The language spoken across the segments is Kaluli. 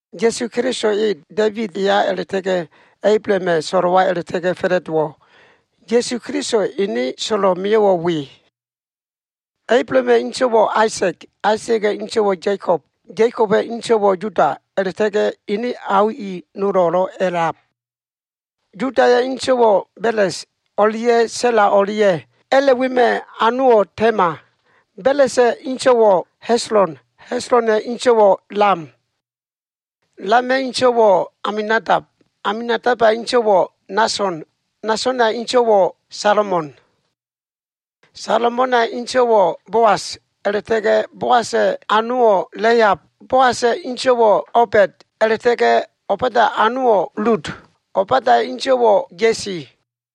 Ya꞉su Keliso e Da꞉ibid eya a꞉la꞉ta꞉ga꞉ Ablahama꞉ so꞉lo꞉wa a꞉la꞉ta꞉ga꞉ fa꞉la꞉dowo꞉. Ya꞉su Kelisowa꞉ ene so꞉lo꞉ mio꞉wo꞉ we. Ablahama꞉ inso꞉wo꞉ Aisa꞉g, Aisa꞉ga꞉ inso꞉wo꞉ Ya꞉kob Ya꞉koba꞉ inso꞉wo꞉ Yuda, a꞉la꞉ta꞉ga꞉ ene ao i nolo꞉lo꞉ a꞉lab. Yudaya꞉ inso꞉wo꞉ Beles o꞉lia꞉ Sa꞉la o꞉lia꞉. A꞉la꞉ wema꞉ anowo꞉ Tema. Belesa꞉ inso꞉wo꞉ Heslon, Heslona꞉ inso꞉wo꞉ Lam. Lama꞉ inso꞉wo꞉ Aminadab, Aminadaba꞉ inso꞉wo꞉ Nason, Nasona꞉ inso꞉wo꞉ Salamon. Salamona꞉ inso꞉wo꞉ Boas, a꞉la꞉ta꞉ga꞉ Boasa꞉ anowo꞉ Lehab. Boasa꞉ inso꞉wo꞉ Obed a꞉la꞉ta꞉ga꞉ Obeda꞉ anowo꞉ Lud. Obeda꞉ inso꞉wo꞉ Ya꞉si.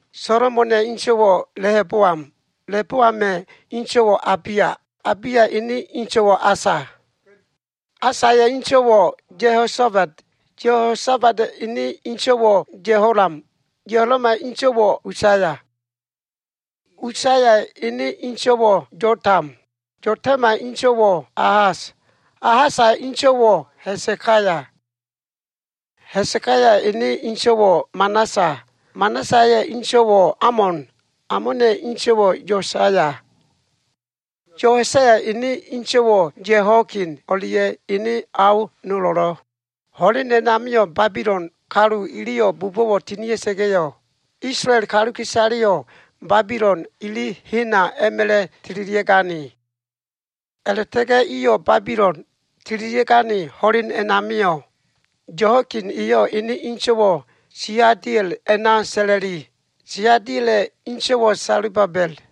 Solomona꞉ inso꞉wo꞉ Lehoboam, Lehoboama꞉ inso꞉wo꞉ Abiya, Abiyaya꞉ ene inso꞉wo꞉ Asa, Asaya꞉ inso꞉wo꞉ Yehosafat, Yehosafata꞉ ene inso꞉wo꞉ Yeholam, Yeholama꞉ inso꞉wo꞉ Usaya Usaya ene inso꞉wo꞉ Yotam, Yotama꞉ inso꞉wo꞉ Ahas, Ahasa꞉ inso꞉wo꞉ Ha꞉sekaya, Ha꞉sekaya ene inso꞉wo꞉ Manasa, Manasaya꞉ inso꞉wo꞉ Amon, Amona꞉ inso꞉wo꞉ Yosaya Yosayaya꞉ ene inso꞉wo꞉ Yehoiakin o꞉lia꞉ ene ao nolo꞉lo꞉. Ho꞉len a꞉namio꞉ Babilon kalu iliyo꞉ bubo꞉wo꞉ tinia꞉sa꞉ga꞉yo꞉, Isolael kaluka꞉isaleyo꞉ Babilon ili hena a꞉ma꞉la꞉ tililia꞉gane. A꞉la꞉ta꞉ga꞉ iyo꞉ Babilon tililia꞉gane ho꞉len a꞉namio꞉, Yehoiakin eyo꞉ ene inso꞉wo꞉ Seadiel a꞉na sa꞉la꞉li. Seadiela꞉ inso꞉wo꞉ Selubabel.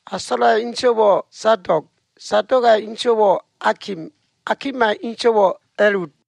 Asola꞉ inso꞉wo꞉ Sadog, Sadoga꞉ inso꞉wo꞉ Akim, Akima꞉ inso꞉wo꞉ Eliud,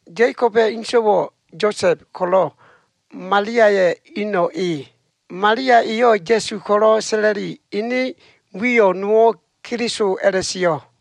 Ya꞉koba꞉ inso꞉wo꞉ Yosa꞉b, ko꞉lo꞉ Maliaya꞉ ino꞉ e. Malia eyo꞉ Ya꞉su ko꞉lo꞉ sa꞉la꞉li. Ene wiyo꞉ nowo꞉ Keliso a꞉la꞉sio꞉.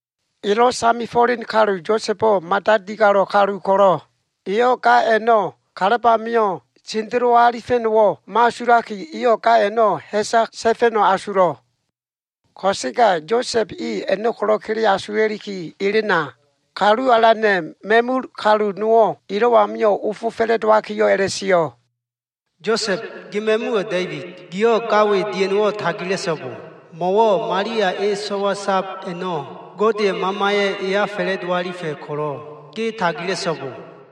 Elo꞉ samefo꞉len kalu Yosa꞉bo꞉ mada digalo꞉ kalu ko꞉lo꞉, eyo꞉ ga a꞉no꞉ kalab amio꞉ sendelo alifa꞉no꞉wo꞉ mo꞉asulaki, eyo꞉ ga a꞉no꞉ ha꞉sa ta꞉fa꞉no꞉ asulo꞉. Ko꞉sega Yosa꞉b e a꞉no꞉ ko꞉lo꞉ kele asula꞉liki elen amio꞉, Kalu Alana꞉ ma꞉mul kalu nowo꞉ elo꞉ amio꞉ ofo fa꞉la꞉dowakiyo꞉ a꞉la꞉sio꞉, “Yosa꞉b gi ma꞉muwo꞉ Da꞉ibid. Giyo꞉ ga we dia꞉no꞉wo꞉ tagila꞉so꞉bo. Mo꞉wo꞉ Malia e so꞉wa sab a꞉no꞉ Godeya꞉ Mamaya꞉ eya fa꞉la꞉do alifa꞉ ko꞉lo꞉ ge tagila꞉so꞉bo.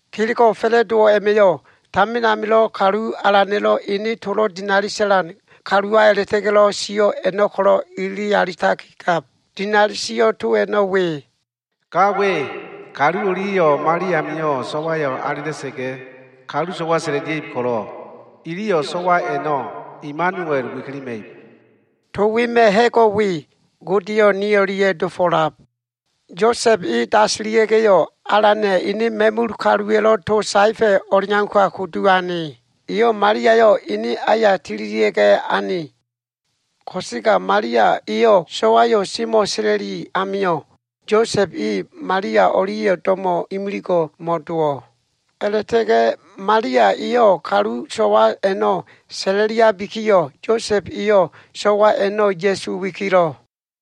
Kelego꞉ fa꞉la꞉dowo꞉ a꞉ma꞉yo꞉, tamin amilo꞉ Kalu Alana꞉lo꞉ ene tolo꞉ dinali sa꞉lan kaluwa a꞉la꞉ta꞉ga꞉lo꞉ sio꞉ a꞉no꞉ kolo꞉ ilili alitakigab. Dinali sio꞉ to a꞉no꞉ we. “Ga we, kalu o꞉lia꞉yo꞉ mo꞉ali amio꞉ so꞉wayo꞉ alela꞉sa꞉ga꞉, kalu so꞉wa sa꞉la꞉lia꞉ib ko꞉lo꞉, iliyo꞉ so꞉wa a꞉no꞉ Imanuel wikilima꞉ib.” To wema꞉ ha꞉go꞉ we, Godeyo꞉ ni o꞉lia꞉ dofo꞉lab. Yosa꞉b e dasilia꞉ga꞉yo꞉, Alana꞉ ene ma꞉mul kaluwa꞉lo꞉ to saefa꞉ o꞉leauka kudu ane. Eyo꞉ Maliayo꞉ ene aya tililia꞉ga꞉ ane, ko꞉sega Malia eyo꞉ sowa꞉yo꞉ semo꞉ sa꞉la꞉li amio꞉, Yosa꞉b e Malia o꞉lia꞉yo꞉ do꞉mo꞉ imiligo꞉ modo꞉wo꞉. A꞉la꞉ta꞉ga꞉ Malia eyo꞉ kalu so꞉wa a꞉no꞉ sa꞉la꞉liabikiyo꞉, Yosa꞉b eyo꞉ so꞉wa a꞉no꞉ Ya꞉su wikilo꞉.